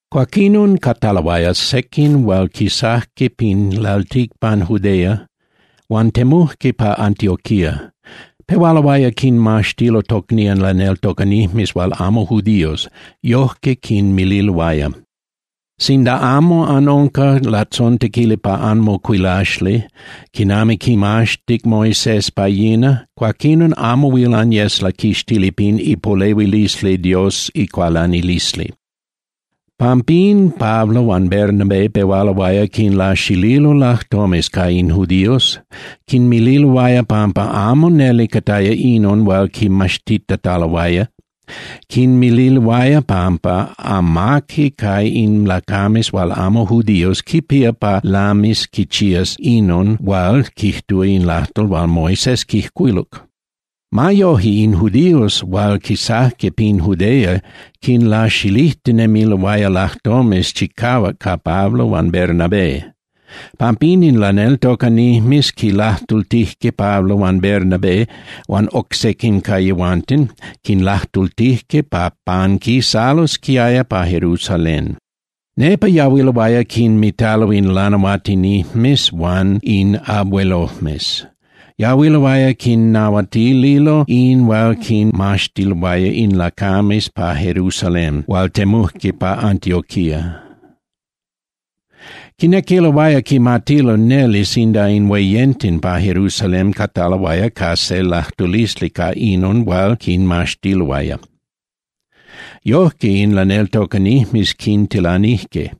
Cuaquinon, cataloaya sequin hual quisajque pin lalticpan Judea huan temujque pa Antioquía. Pehualoaya quinmaxtilo tocnían laneltocanijmes hual amo judíos, yojque quinmililoaya: —Sinda amo anunca latzontequili pa anmocuilaxli quinami quimaxtic Moisés pa yina, cuaquinon amo huil anyes laquixtili pin ipolehuilisli Dios icualanilisli. Pampín Pablo huan Bernabé pehualoaya quinlaxililo lajtomes ca in judíos, quinmililoaya pampa amo neli cataya inon hual quimaxtitataloaya, quinmililoaya pampa amaqui ca in lacames hual amo judíos quipía pa lamis quichías inon hual quijtúa in lajtol hual Moisés quijcuiluc. Ma yoje, in judíos hual quisajque pin Judea quinlaxilijtinemiloaya lajtomes chicahuac ca Pablo huan Bernabé. Pampín in laneltocanijmes quinlajtultijque Pablo huan Bernabé huan oc sequin ca yehuanten, quinlajtultijque pa panquisalosquiaya pa Jerusalén. Nepa yahuiloaya quinmitalo in lanahuatinijmes huan in abuelojmes. Yahuiloaya quinnahuatililo in hual quinmaxtiloaya in lacames pa Jerusalén hual temujque pa Antioquía. Quinequiloaya quimatilo neli sinda in hueyenten pa Jerusalén cataloaya ca se lajtulisli ca inon hual quinmaxtiloaya. Yojque, in laneltocanijmes quintilanijque.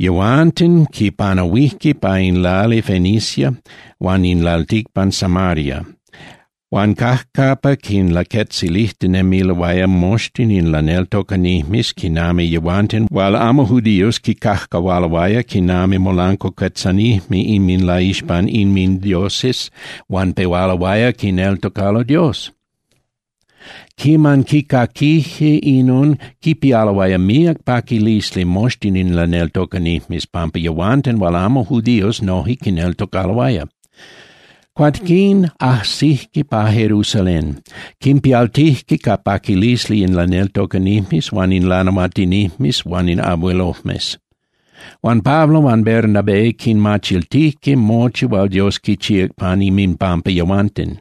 Yehuanten quipanahuijque pa in lali Fenicia huan in lalticpan Samaria, huan cajcapa quinlaquetzilijtinemiloaya moxtin in laneltocanijmes quinami yehuanten hual amo judíos quicajcahualoaya quinami molancuacuetzanijme inminlaixpan inmindioses huan pehualoaya quineltocalo Dios. Quiman quicaquijque inon, quipialoaya míac paquilisli moxtin in laneltocanijmes pampa yehuanten hual amo judíos noje quineltocaloaya. Cuaquín ajsijque pa Jerusalén. Quimpialtijque ca paquilisli in laneltocanijmes huan in lanahuatinijmes huan in abuelojmes. Huan Pablo huan Bernabé quinmachiltijque mochi hual Dios quichíac pan inminpampa yehuanten.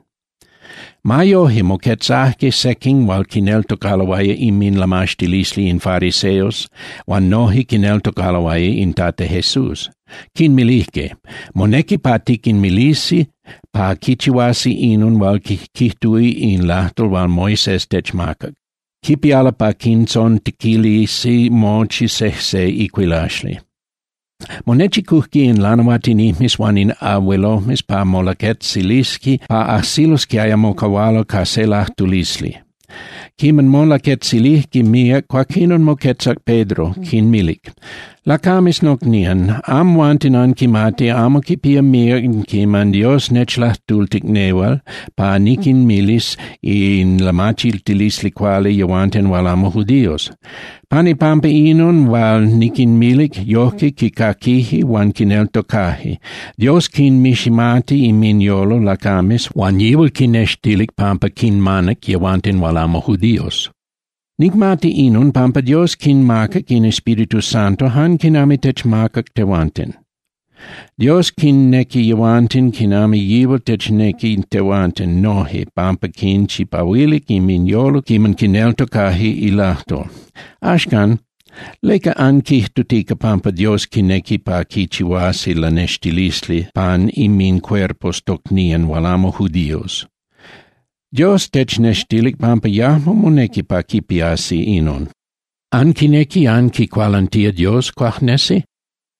Ma yoje, moquetzajque sequin hual quineltocaloaya inminlamaxtilisli in fariseos huan noje quineltocaloaya in Tata Jesús, quinmilijque: —Monequi pa tiquinmilisi pa quichihuasi inon hual quijtúa in lajtol hual Moisés techmacac, quipialo pa quintzontequilisi mochi sejse icuilaxli. Monechicujque in lanahuatinijmes huan in abuelojmes pa molaquetzilisqui pa ajsilosquiaya mocahualo ca se lajtulisli. Quiman molaquetzilijque míac, cuaquinon moquetzac Pedro, quinmilic: —Lacames nocnían, amhuanten anquimati amo quipía míac quiman Dios nechlajtultic nehual pa niquinmilis in lamachiltilisli cuali yehuanten hual amo judíos. Pan ipampa inon hual niquinmilic, yojque quicaquije huan quineltocaje. Dios quinmiximati inminyolo lacames huan yihual quinextilic pampa quinmanac yehuanten hual amo judíos. Nicmati inon pampa Dios quinmacac in Espíritu Santo jan quinami techmacac tehuanten. Dios quinnequi yehuanten quinami yihual technequi tehuanten noje pampa quinchipahuilic inminyolo quiman quineltocaje ilajtol. Axcan, ¿leca anquijtutica pampa Dios quinequi pa quichihuasi lanextilisli pan inmincuerpos tocnían hual amo judíos? Dios technextilic pampa yajmo monequi pa quipiasi inon. ¿Anquinequi anquicualantía Dios, cuajnesi?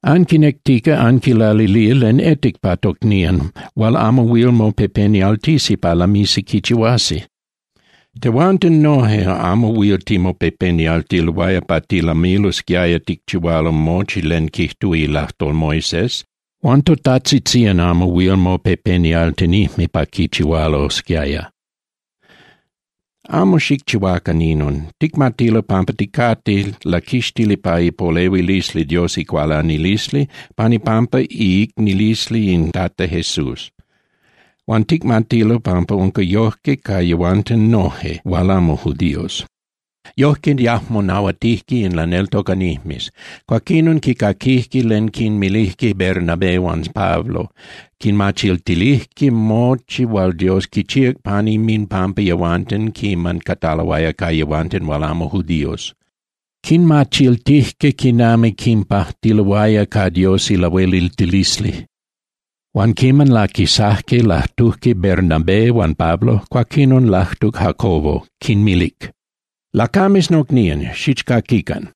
Anquinectica anquilalilía len etic pa tocnían hual amo huil mopepenialtisi pa lamisi quichihuasi. Tehuanten noje amo huil timopepenialtiloaya pa tilamilosquiaya ticchihualo mochi len quijtúa ilajtol Moisés, huan totajtzitzían amo huil mopepenialtinijme pa quichihualosquiaya. Amo xicchihuacan inon. Ticmatilo pampa ticate laquixtili pa ipolehuilisli Dios icualanilisli pan ipampa iicnililisli in Tata Jesús. Huan ticmatilo pampa unca yojque ca yehuanten noje hual amo judíos. Yojque, yajmo nahuatijque in laneltocanijmes. Cuaquinon quicaquijque len quinmilijque Bernabé huan Pablo, quinmachiltilijque mochi hual Dios quichíac pan inminpampa yehuanten quiman cataloaya ca yehuanten hual amo judíos. Quinmachiltijque quinami quinpajtiloaya ca Dios ilahueliltilisli. Huan quiman laquisajque lajtujque Bernabé huan Pablo, cuaquinon lajtuc Jacobo, quinmilic: —Lacames nocnían, xichcaquican.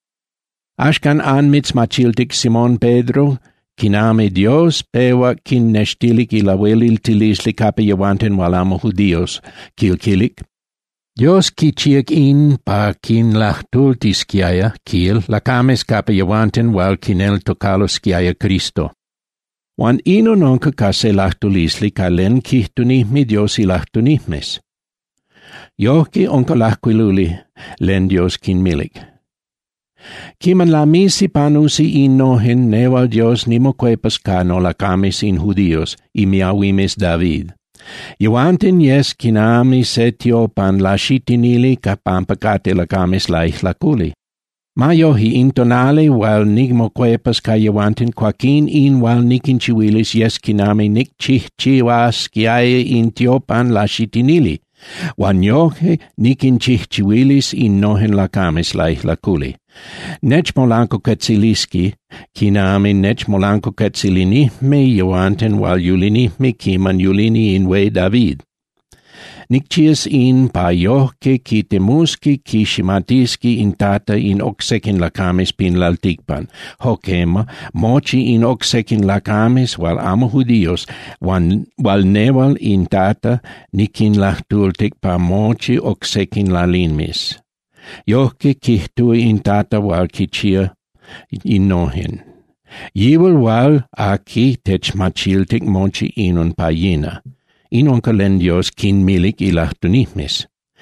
Axcan anmitzmachiltic Simón Pedro quinami Dios pehuac quinnextilic ilahueliltilisli capa yehuanten hual amo judíos, quil quilic, Dios quichíac in pa quinlajtultisquiaya, quil, lacames capa yehuanten hual quineltocalosquiaya Cristo. Huan inon unca ca se lajtulisli ca len quijtunijme Dios ilajtunijmes. Yojque unca lajcuiluli len Dios quinmilic: Quiman lamisi panusi innojen, nehual Dios nimocuepas ca nolacames in judíos, imiahuimes David, yehuanten yes quinami se tiopan laxitinili pampa cate lacames laijlaculi. Ma yoje, in tonali hual nimocuepas ca yehuanten, cuaquín in hual niquinchihuilis yes quinami nicchijchihuasquiaya in tiopan laxitinili, huan yoje niquinchijchihuilis innojen lacames laijlaculi. Nechmolancuacuetzilisqui quinami nechmolancuacuetzilinijme yehuanten hual yulinijme quiman yulini in hué David. Nicchihuas in pa yojque quitemusqui quiximatisqui in Tata in oc sequin lacames pin lalticpan, jo quema, mochi in oc sequin lacames hual amo judíos hual nehual in Tata niquinlajtultic pa mochi oc sequin lalimes. Yojque quijtúa in Tata hual quichihua innojen, yihual hual aqui techmachiltic mochi inon pa yina. In unca len Dios quinmilic ilajtunijmes.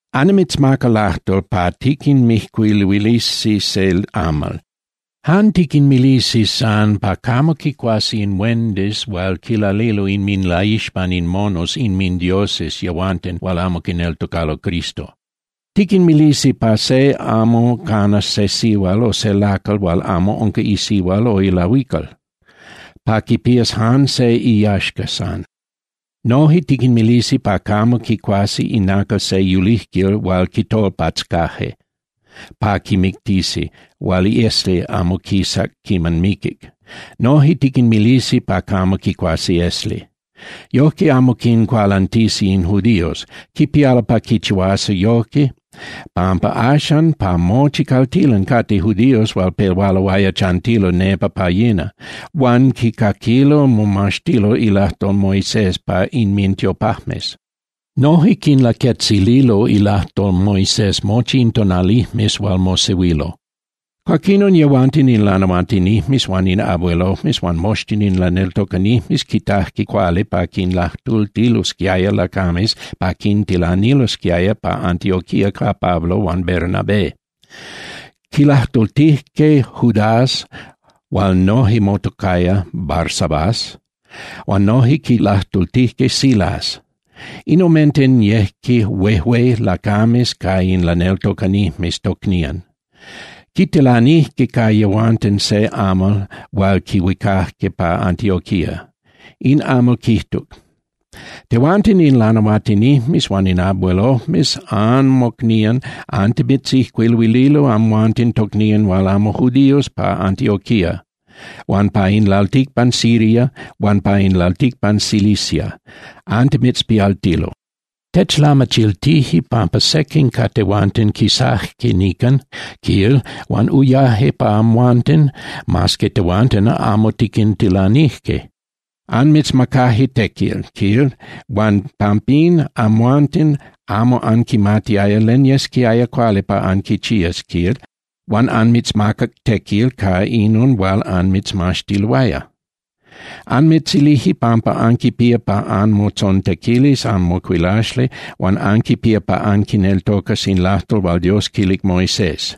Annimitzmaca lajtol pa tiquinmijcuiluilisi se amal. Jan tiquinmilisi san pa camo quicuasi in huendis hual quilalilo inminlaixpan in monos inmindioses yehuanten hual amo quineltocalo Cristo. Tiquinmilisi pa se amo canas se sihual o se lacal hual amo unca isihua o ilahuical, pa quipías jan se iyaxca san. Noje tiquinmilisi pa camo quicuasi inacal se yulijquil hual quitolpatzcaje pa quimictisi hual iesli amo quisac quiman miquic. Noje tiquinmilisi pa camo quicuasi esli. Yojque amo quincualantisi in judíos. Quipialo pa quichihuasi yoje pampa axan pa mochi caltilan cate judíos hual pehualoaya chantilo nepa pa yina, huan quicaquilo momaxtilo ilajtol Moisés pa inmintiopajmes. Noje quinlaquetzililo ilajtol Moisés mochi in tonalijmes hual mosehuilo. Cuaquinon yehuanten in lanahuatinijmes huan in abuelojmes huan moxtin in laneltocanijmes quitajque cuali pa quinlajtultilosquiaya lacames pa quintilanilosquiaya pa Antioquía ca Pablo huan Bernabé. Quilajtultijque Judas hual noje motocaya Barsabás huan noje quilajtultijque Silas. In omenten yejque huejué lacames ca in laneltocanijmes tocnían. Quitilanijque ca yehuanten se amal hual quihuicajque pa Antioquía. In amal quijtuc: “Tehuanten in lanahuatinijmes huan in abuelojmes anmocnían antimitzijcuiluililo amhuanten tocnían hual amo judíos pa Antioquía huan pa in lalticpan Siria huan pa in lalticpan Cilicia, antimitzpialtilo. Techlamachiltije pampa sequin ca tehuanten quisaje nican, quil, huan uyaje pa amhuanten, mas que tehuanten amo tiquintilanije. Anmitzmacaje tequil, quil, huan pampín amhuanten amo anquimatiaya len yesquiaya cuali pa anquichías, quil, huan anmitzmacac tequil ca inon hual anmitzmaxtiloaya. Anmitzilije pampa anquipía pa anmotzontequilis anmocuilaxli huan anquipía pa anquineltocas in lajtol hual Dios quilic Moisés.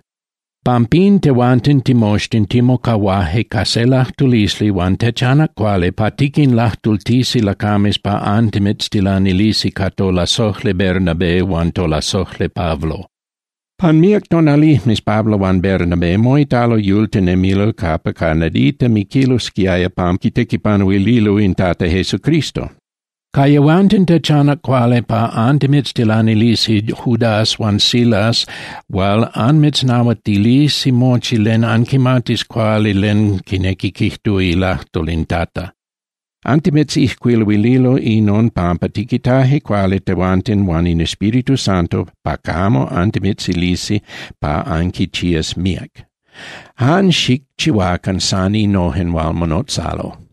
Pampín tehuanten timoxtin timocahuaje ca se lajtulisli huan techanac cuali pa tiquinlajtultisi lacames pa antimitztilanilisi ca tolasojli Bernabé huan tolasojli Pablo. Pan míac tonalijmes Pablo huan Bernabé moitalo yultinemilo capa ca nadita miquilosquiaya pampa quitequipanuililo in Tata Jesucristo. Ca yehuanten techanac cuali pa antimitztilanilisi Judas huan Silas hual anmitznahuatilisi mochi pa anquimatis cuali len quinequi quijtúa ilajtol in Tata. Antimitzijcuiluililo inon pampa tiquitaje cuali tehuanten huan in Espíritu Santo pa camo antimitzilisi pa anquichías míac. Jan xicchihuacan san innojen hual monotzalo.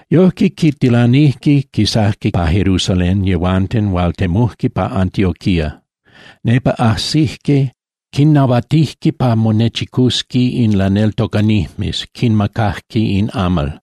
Yojque, quintilanijque, quisajque pa Jerusalén yehuanten, huan temujque pa Antioquía. Nepa ajsijque, quinnahuatijque pa monechicusqui in laneltocanijmes, quinmacajque in amal.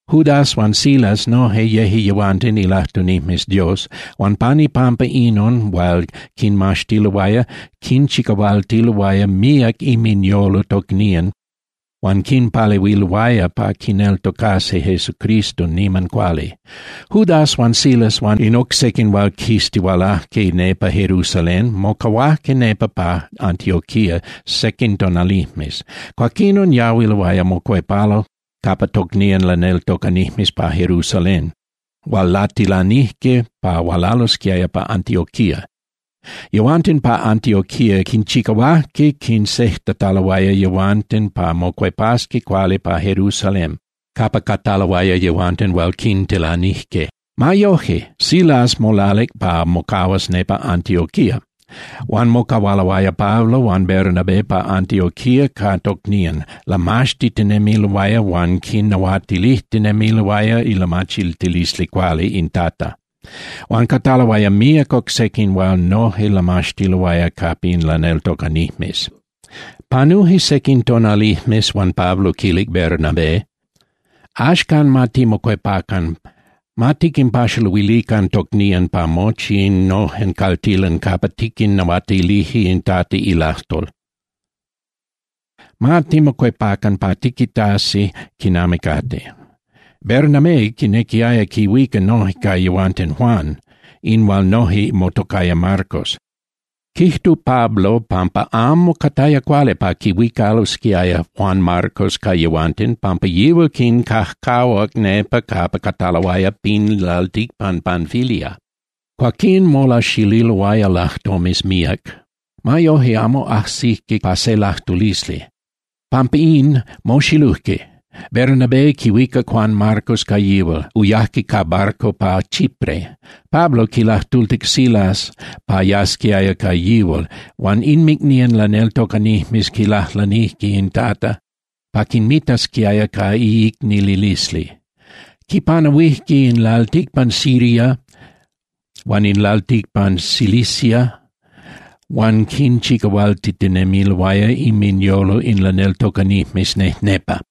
Judas huan Silas noje yeje yehuanten ilajtunijmes Dios huan pan ipampa inon hual quinmaxtiloaya, quinchicahualtiloaya míac inminyolo tocnían huan quinpalehuiloaya pa quineltocasqui Jesucristo niman cuali. Judas huan Silas huan in oc sequin hual quistihualajque nepa Jerusalén mocahuajque nepa pa Antioquía sequin tonalijmes, cuaquinon yahuiloaya mocuepalo capa tocnían laneltocanijmes pa Jerusalén hual latilanijque pa hualalosquiaya pa Antioquía. Yehuanten pa Antioquía quinchicahuajque quinsejtataloaya yehuanten pa mocuepasqui cuali pa Jerusalén capa cataloaya yehuanten hual quintilanijque. Ma yoje, Silas molalic pa mocahuas nepa Antioquía. Huan mocahualoaya Pablo huan Bernabé pa Antioquía ca tocnían, lamaxtitinemiloaya huan quinnahuatilijtinemiloaya ilamachiltilisli cuali in Tata. Huan cataloaya míac oc sequin hual noje lamaxtiloaya capa in laneltocanijmes. Panuje sequin tonalijmes, huan Pablo quilic Bernabé: —Axcan, ma timocuepacan, ma tiquinpaxaluilican tocnían pa mochi innojen caltilan capa tiquinnahuatilije in Tata ilajtol. Ma timocuepacan pa tiquitasi quinami cate. Bernabé quinequiaya quihuica noje ca yehuanten Juan, in hual noje motocaya Marcos. Quijtuc Pablo pampa amo cataya cuali pa quihuicalosquiaya Juan Marcos ca yehuanten pampa yihual quincajcahuac nepa capa cataloaya pin lalticpan Panfilia. Cuaquín molaxililoaya lajtomes míac. Ma yoje, amo ajsijque pa se lajtulisli. Pampa in, moxilujque. Bernabé quihuicac Juan Marcos ca yihual, uyajque ca barco pa Chipre. Pablo quilajtultic Silas pa yasquiaya ca yihual, huan inmicnían laneltocanijmes quilajlanijque in Tata pa quinmitasquiaya ca iicnililisli. Quipanahuijque in lalticpan Siria huan in lalticpan Cilicia huan quinchicahualtitinemiloaya inminyolo in laneltocanijmes nejnepa.